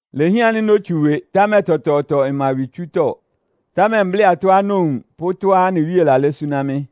Ilehián ánɩ́ nótsu ɩwɩ, támɛ tɔtɔɔtɔ ɩma ɩwɩtsútɔ́. Támɛ mblɩ́ atɔ́á nowun pʋ́ tɔ́á anɩ Wíe lalɛ́ súná mɩ́.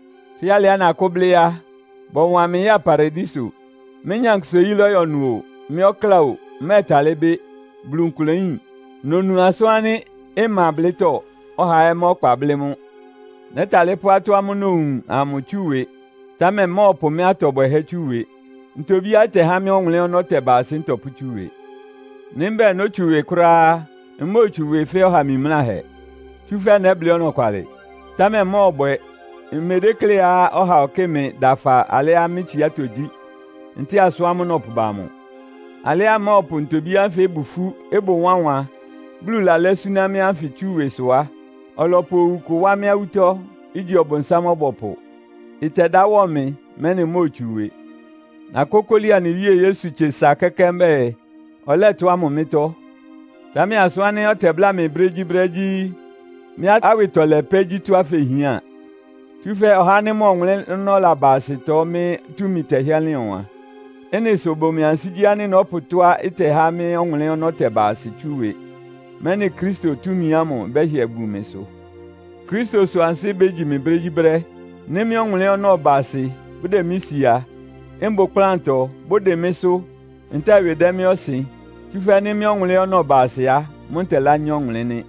Fɛ́ alɩá nakʋ́blɩ́ á, bɔwan mɩ ya Paradiso. (Mɩ́ nyankpʋsa-oyí lɔ́yɔ ɩnʋ o, mɩ́ ɔkláa o, mmɛ́ɛtalɩ́ bɩ́. Bulu nkʋlɛ yín.) Nonu asʋ́n ánɩ́ ɩma blɩ́tɔ́, ɔhaa ɛ́ má ɔkpa blɩ́ mʋ́. Nɛ́talɩ́ pʋ́ ɩtɔ́ ámʋ́ʋ́ nowun amʋ tsú ɩwɩ, támɛ mmɔ́ɔpʋ mɩ́ atɔ bwɛhɛ́ tsú ɩwɩ. Ntobíá ɩtɛhá mɩ́ ɔwʋnlɩ́n ɔnɔ́ tɛba asɩ ntɔpʋ́tsú ɩwɩ. Nɩ́ mbɛ́ɛ nótsu ɩwɩ kʋ́ráá á, mmóotsu ɩwɩ fɛ́ ɔha mimláhɛ, tsúfɛ́ nɛ́blɩ́ ɔnɔkwalɩ. Támɛ mmɔ́ɔbwɛ. Mmedékléá ɔhaa ɔkɩ́ɩ mɩ dafa alɩá mɩ́ tsiátɔ́ gyí, ntɛ́ɛ asʋ́n ámʋ́ʋ́ nɔpʋba amʋ. Alɩá mmɔ́ɔpʋ ntobí ánfɩ ɩbʋ ifú, ɩbʋ wánwan, Bulu lalɛ́ súná mɩ́ ánfɩ tsú ɩwɩ sʋ á, ɔlɔpʋ owu kʋ wá mɩ́ awútɔ́, igyi Ɔbʋnsám-ɔbɔpʋ. Ɩtɛdá wɔ mɩ́, mɛ́nɩ mmóotsu ɩwɩ. Nakókóli anɩ Wíe Yesu tse sa kɛ́kɛ́ mbɛ́ɛ, ɔlɛ́ ɩtɔ́ ámʋ mɩ́tɔ́. Támɛ asʋ́n ánɩ́ ɔtɛbláa mɩ brégyíbrɛ́ gyí, “Mɩ́ awɩtɔlɛ pɛ́ gyí tɔ́á fehián. Tsúfɛ́ ɔhá ánɩ́ mʋ ɔwʋnlɩ́n ɔnɔ́ laba asɩtɔ mɩ́ túmi tɛhɩ́ɛ́ lɩn ɔwan.” Ɩ́nɩ sʋ ɩbʋ mɩ ansigyí ánɩ́ nɔ́pʋ tɔ́á ɩtɛhá mɩ́ ɔwʋnlɩ́n ɔnɔ́ tɛba asɩ tsú ɩwɩ, mɛ́nɩ Kristo túmi ámʋ ɩbɛ́hɩɛ bun mɩsʋ. Kristo sʋ ansɩ́ bégyi mɩ brégyíbrɛ́. Nɩ́ mɩ́ ɔwʋnlɩ́n ɔnɔ́ ɩba asɩ, bʋdɛ mɩ́ sia, mbʋ ɩkplántɔ, bʋdɩn mɩ́sʋ́, ntɛ́ɛ ɩwɩ dɛ mɩ́ ɔsɩn, tsúfɛ́ nɩ́ mɩ́ ɔwʋnlɩ́n ɔnɔ́ ɩba asɩ á, mʋ́ ntɛlányá ɔwʋnlɩ́n nɩ́.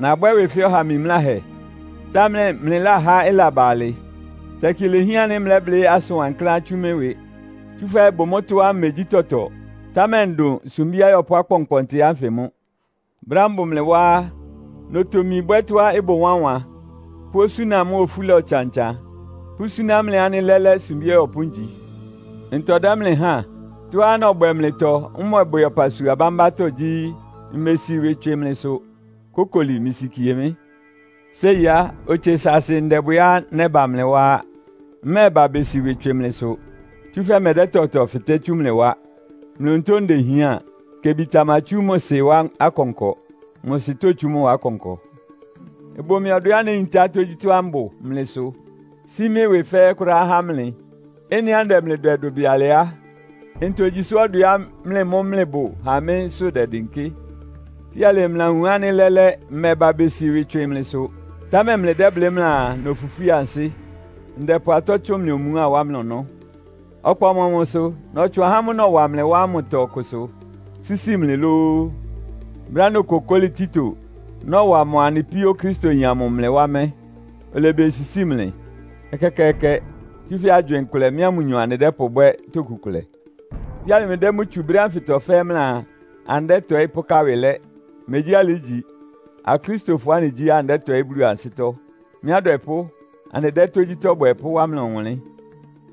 Nabwɛ́ ɩwɩ fɛ́ ɔha mimláhɛ, támɛ mlɩláhá ɩlaba alɩ. Tɛkɩ ilehián ánɩ́ mlɛ́blɩ́ asʋn wankláán tsú mɩ́ ɩwɩ. Tsúfɛ́ ɩbʋ mʋ́tɔ́á mmegyí tɔtɔ, támɛ ndʋn “sumbí ayɔpʋ́ akpɔnkpɔntɩ” ánfɩ mʋ́. Brɛ́á mbʋ mlɩ wá á, notomi bwɛ́ tɔ́á ɩbʋ wánwan pʋ́ osúna mʋ́a ofúla ɔtsan-ɔtsan, pʋ́súná mlɩ ánɩ́ lɛ́lɛ́ sumbí ɔyɔpʋ́ ngyi. Ntɔ dɛ́ mlɩ háan? Tɔ́á nɔbwɛ mlɩtɔ, mmɔbwɛ ɔpasua bámbátɔ́ gyí, mmesi ɩwɩ tswɩ mlɩsʋ. Kókoli, mlɩsikie mɩ́! Séi á, otse saasɩ ndɛbwɛá nɛ́ba mlɩ wá á. Mmɛ́ɛba besi ɩwɩ tswɩ mlɩsʋ, tsúfɛ́ mmɛdɛ́ tɔtɔ fɩtɛ́ tsú mlɩ wá. Mlɩ onutó ndehián. Kebi tamatsú mʋ sɩ wá akɔnkɔ, mʋ sɩ tótsú mʋ wá akɔnkɔ. Ɩbʋ mɩ ɔdwɛá néyintá tógyítɔ́á mbʋ mlɩ sʋ, sí mɩ́ ɩwɩ fɛ́ɛ́ kʋ́ráá há mlɩ. Ɩ́nɩá ndɛ mlɩ dwɛ dʋbɩ alɩ á, ntogyi sʋ ɔdwɛá mlɩ mʋ́ mlɩbʋ há mɩ́sʋ́ dɛdɩnkɩ́? Fíalɩ mlɩlawun ánɩ́ lɛ́lɛ́, mmɛba besi ɩwɩ tswɩ mlɩsʋ, támɛ mlɩdɛ́blɩ́ mlɩaa, nofwifwí ansɩ́. Ndɛpʋ atɔ́ tsʋn mlɩ omuá wá mlɩ ɔnɔ́. Ɔkpa ɔmɔmʋsʋ? Nɔtsʋn ahá ámʋ́ʋ́ nɔwa mlɩ wá ámʋtɔ ɔkʋsʋ sísi mlɩ lóó? Brɛ́á nokokóli Tito, nɔwa mʋa anɩ píó Okristoyin amʋ mlɩ wá mɛ́, olebesisíi mlɩ? Ɛkɛkɛɛkɛ! Tsúfɛ́ agywɩɩn kʋlɛ mɩ́a mʋnyɔ anɩdɛ́pʋbwɛ́ toku kʋlɛ. Fíalɩ mlɩdɛ́ mʋ́ tsu brɛ́ ánfɩtɔ fɛ́ɛ́ mlɩaa, anɩdɛ́tɔɩ́ pʋ́ká ɩwɩ lɛ́. Megyí alɩ ígyi. Akristofɔ anɩgyí, anɩdɛ́tɔɩ́ Bulu ansɩ́tɔ́. Mɩ́ adwɛpʋ́, anɩdɛ́ tógyítɔ́ bwɛ pʋ́wá mlɩ ɔwʋnlɩ́n.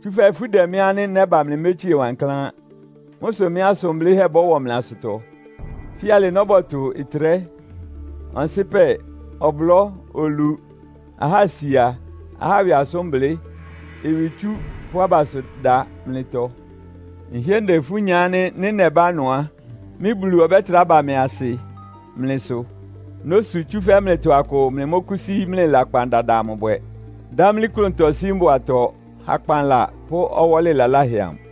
Tsúfɛ́ ifú dɛ mɩ́ ánɩ́ nɛ́ba mlɩmétsíe wankláán. Mʋ́ sʋ mɩ́ asʋn blɩ́hɛ́ bɔ́wɔ mlɩ asʋtɔ. Fíalɩ nɔ́bɔtʋ ɩtrɛ́, ɔnsɩpɛ, ɔblɔ́, olu, ahásia, ahá ɩwɩ asʋ́nblɩ́, ɩwɩtsú pʋ́ abasʋda mlɩtɔ. Nhɩ́ɛ́ ndɛ ifú nya ánɩ́ nɩ́ nɛbá ɩnʋ á, mɩ́ Bulu ɔbɛ́trá ba mɩ asɩ mlɩ sʋ. Nósu, tsúfɛ́ mlɩtɔ akʋ mlɩmɔ́kʋ́sí mlɩ lakpan dada amʋ bwɛ, dámlí klʋntɔ sí mbʋatɔ, hakpanla pʋ́ ɔwɔ́lɩ laláhɛ amʋ.